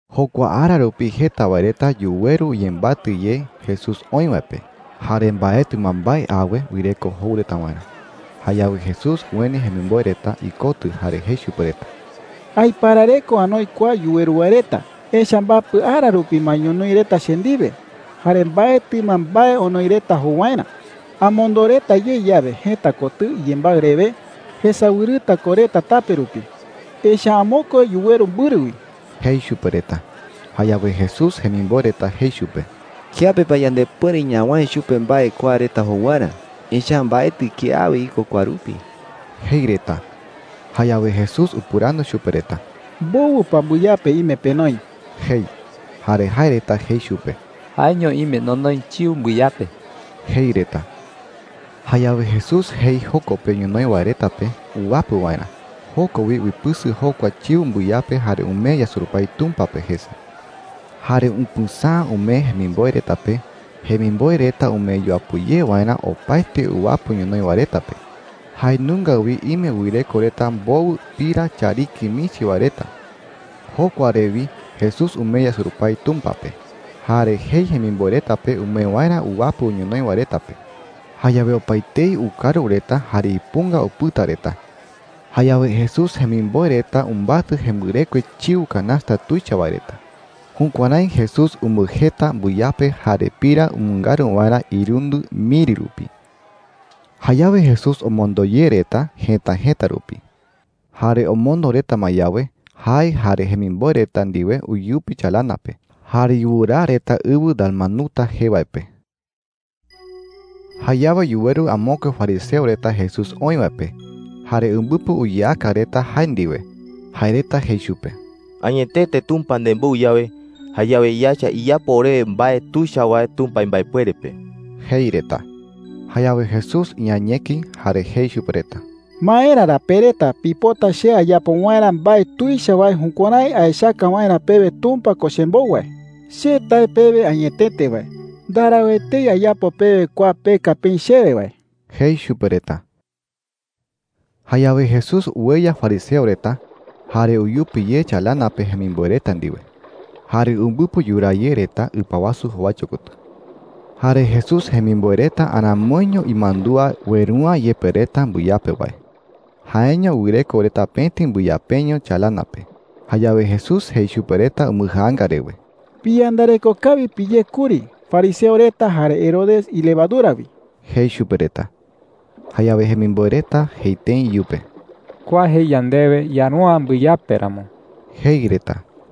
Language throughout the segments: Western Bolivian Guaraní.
Jokua ara rupi jeta wae reta yuweru uyembatɨ ye Jesús oï wae pe. Jare mbaetɨ ma mbae awe wɨreko jou reta waerä. Jayawe Jesús ueni jemimboe reta ikotɨ jare jei chupe reta: “Aiparareko anoi kua yuweru wae reta. Echa’ä mbapɨ ara rupi ma ñonoï reta che ndiwe, jare mbaetɨ ma mbae onoi reta jou waerä,” jei. “Amondo reta ye yawe jëta kotɨ iyembaɨ rewe, jesawɨrɨta ko reta tape rupi. Echa’ä amokue yuweru mbɨrɨ wi,” jei chupe reta. Jayawe Jesús jemimboe reta jei chupe: “¿Kiape pa yandepuere ñawäe chupe mbae kua reta jou waerä? Echa’ä mbaetɨ kiawe iko kua rupi,” jei reta. Jayawe Jesús upɨrandu chupe reta: “¿Mbowɨ pa mbɨyape ime penoi?” jei. Jare jae reta jei chupe: “Jaeño ime nonoi chiu mbɨyape,” jei reta. Jayawe Jesús jei joko pe ñonoï wae reta pe uwapɨ waerä. Joko wi uipɨsɨ jokua chiu mbɨyape jare umee yasurupái Tumpa pe jese. Jare upɨsäa umee jemimboe reta pe, jemimboe reta umee yuapɨ ye waerä opaete uwapɨ ñonoï wae reta pe. Jae nunga wi ime wɨreko reta mbowɨ pira chariki michi wae reta. Jokua re wi Jesús umee yasurupái Tumpa pe. Jare jei jemimboe reta pe umee waerä uwapɨ ñonoï wae reta pe. Jayawe opaetei ukaru reta jare ipunga upɨta reta. Jayawe Jesús jemimboe reta umbatɨ jembɨrekue chiu canasta tuicha wae reta. Jukuärái Jesús umbɨjeta mbɨyape jare pira umɨngaru waerä irundɨ miri rupi. Jayawe Jesús omondo ye reta jëta jëta rupi. Jare omondo reta ma yawe, jae jare jemimboe reta ndiwe uyupi chalana pe, jare yuraa reta ɨwɨ Dalmanuta jee wae pe. Jayawe yuweru amokue fariseo reta Jesús oï wae pe, jare umbɨpɨ uyeaka reta jae ndiwe. Jae reta jei chupe: “Añetete Tumpa nembou yawe, jayawe yaecha iyapo orewe mbae tuicha wae Tumpa imbaepuere pe,” jei reta. Jayawe Jesús iañeki jare jei chupe reta: “¿Maera ra pe reta pipota che ayapo waerä mbae tuicha wae jukuärái aechaka waerä pewe Tumpa ko chembou wae?” jei. “Che tae pewe añetete wae, ndarau etei ayapo pewe kua peka peï chewe wae,” jei chupe reta. Jayawe Jesús ueya fariseo reta, jare uyupi ye chalana pe jemimboe reta ndiwe. Jare umbɨpɨ yuraa ye reta ɨpa wasu jowaicho kotɨ. Jare Jesús jemimboe reta aramoiño imandúa ueru’ä yepe reta mbɨyape wae. Jaeño wɨreko reta pëti mbɨyapeño chalana pe. Jayawe Jesús jei chupe reta umbɨjaanga rewe: “Piyandareko kawi piyé kuri fariseo reta jare Herodes ilevadura wi,” jei chupe reta. Jayawe jemimboe reta jei tëi iyupe: “Kua jei yandewe yaru’ä mbɨyape ramo,” jei reta.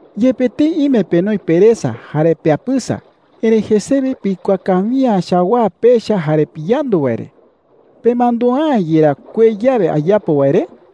“Yepe tëi ime penoi peresa jare peapɨsa, erëi jesewe pikuaa kawi’ä chawaa pecha jare piyandu wae re. ¿Pemandua’ä yerá kuee yawe ayapo wae re?” jei.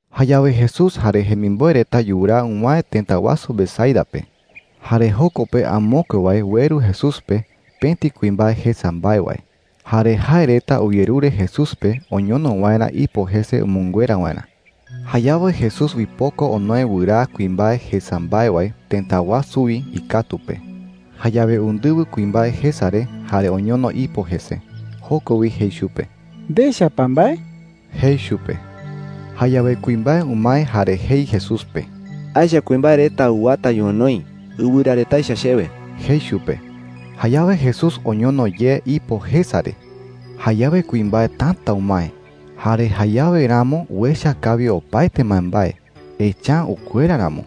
Jayawe Jesús jare jemimboe reta yuraa uwäe tëta wasu Betsaida pe. Jare joko pe amokue wae ueru Jesús pe pëti kuimbae jesa mbae wae. Jare jae reta uyerure Jesús pe oñono waerä ipo jese umɨnguera waerä. Jayawe Jesús uipoko onoe wɨraa kuimbae jesa mbae wae tëta wasu wi ikatu pe. Jayawe undɨwɨ kuimbae jesa re jare oñono ipo jese. Joko wi jei chupe: “¿Ndecha pa mbae?” jei chupe. Jayawe kuimbae umae jare jei Jesús pe: “Aecha kuimbae reta uwata ñonoï ɨwɨra reta echa chewe,” jei chupe. Jayawe Jesús oñono ye ipo jesa re. Jayawe kuimbae täta umae, jare jayawe ramo uecha kawi opaete mbaembae, echa’ä ukuera ramo.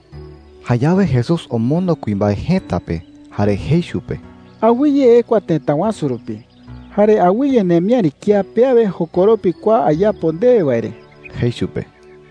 Jayawe Jesús omondo kuimbae jëta pe jare jei chupe: “Awɨye ekua tëta wasu rupi. Jare awɨye nemiäri kía pe awe jokoropi kua ayapo ndewe wae re,” jei chupe.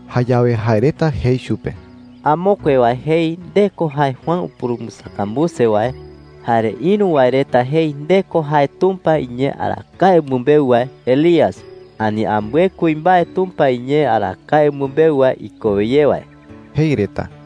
Jayawe jae reta jei chupe: “Amokue wae jei nde ko jae Juan upurumbɨsakambuse wae. Jare ïru wae reta jei nde ko jae Tumpa iñee arakae umɨmbeu wae Elías, ani ambɨe kuimbae Tumpa iñee arakae umɨmbeu wae ikowe ye wae,” jei reta.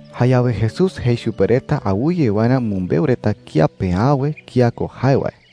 Jayawe Jesús jei chupe reta awɨye waerä umɨmbeu reta kía pe awe kía ko jae wae.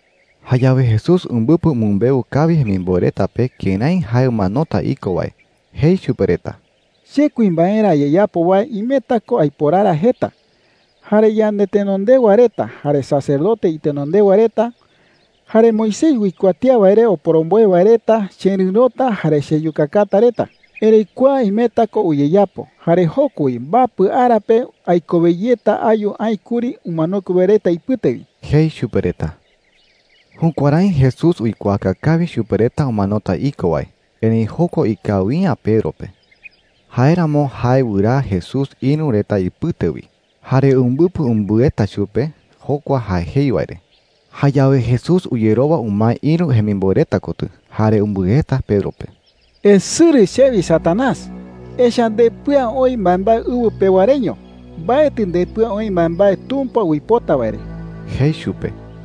Jayawe Jesús umbɨpɨ umɨmbeu kawi jemimboe reta pe kërái jae umanota iko wae. Jei chupe reta: “Che kuimbaerä ayeyapo wae imeta ko aiporara jeta. Jare yandetenondewa reta, jare sacerdote itenondewa reta, jare Moisés uikuatía wae re oporomboe wae reta chererɨ̈rota jare cheyukakata reta,” jei. “Erëi kua imeta ko uyeyapo. Jare joko wi mbapɨ ara pe aikowe yeta ayu aï kuri umanokue wae reta ipɨte wi,” jei chupe reta. Jukuärái Jesús uikuaaka kawi chupe reta umanota iko wae. Erëi jokua ikawi’ä Pedro pe. Jáeramo jae wɨraa Jesús ïru reta ipɨte wi, jare umbɨpɨ umbɨeta chupe jokua jae jei wae re. Jayawe Jesús uyerowa umae ïru jemimboe reta kotɨ, jare umbɨeta Pedro pe. “Esɨrɨ chewi, Satanás,” jei chupe. “Echa’ä ndepɨa oï mbaembae ɨwɨ pewa reño. Mbaetɨ ndepɨa oï mbaembae Tumpa uipota wae re,” jei chupe.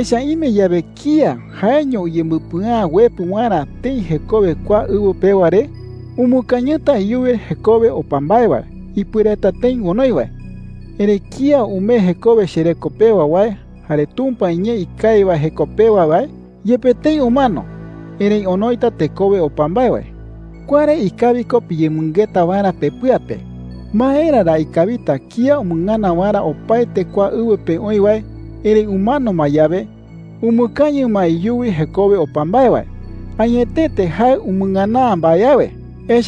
“Echa’ä ime yawe kía jaeño uyembɨpɨa’ä uepɨ waerä tëi jekowe kua ɨwɨ pewa re, umɨkañɨta iyuwi jekowe opa mbae wae ipuereta tëi onoi wae. Erëi kía umee jekowe chereko pewa wae jare Tumpa iñee ikawi wae jeko pewa wae, yepe tëi umano, erëi onoita tekowe opa mbae wae,” jei chupe reta. “Kua re ikawi ko piyemɨngeta waerä pepɨa pe. ¿Maera ra ikawita kía umɨngana waerä opaete kua ɨwɨ pe oï wae, erëi umano ma yawe, umɨkañɨ ma iyuwi jekowe opa mbae wae? Añetete jae umɨngana’ä mbae awe,” jei.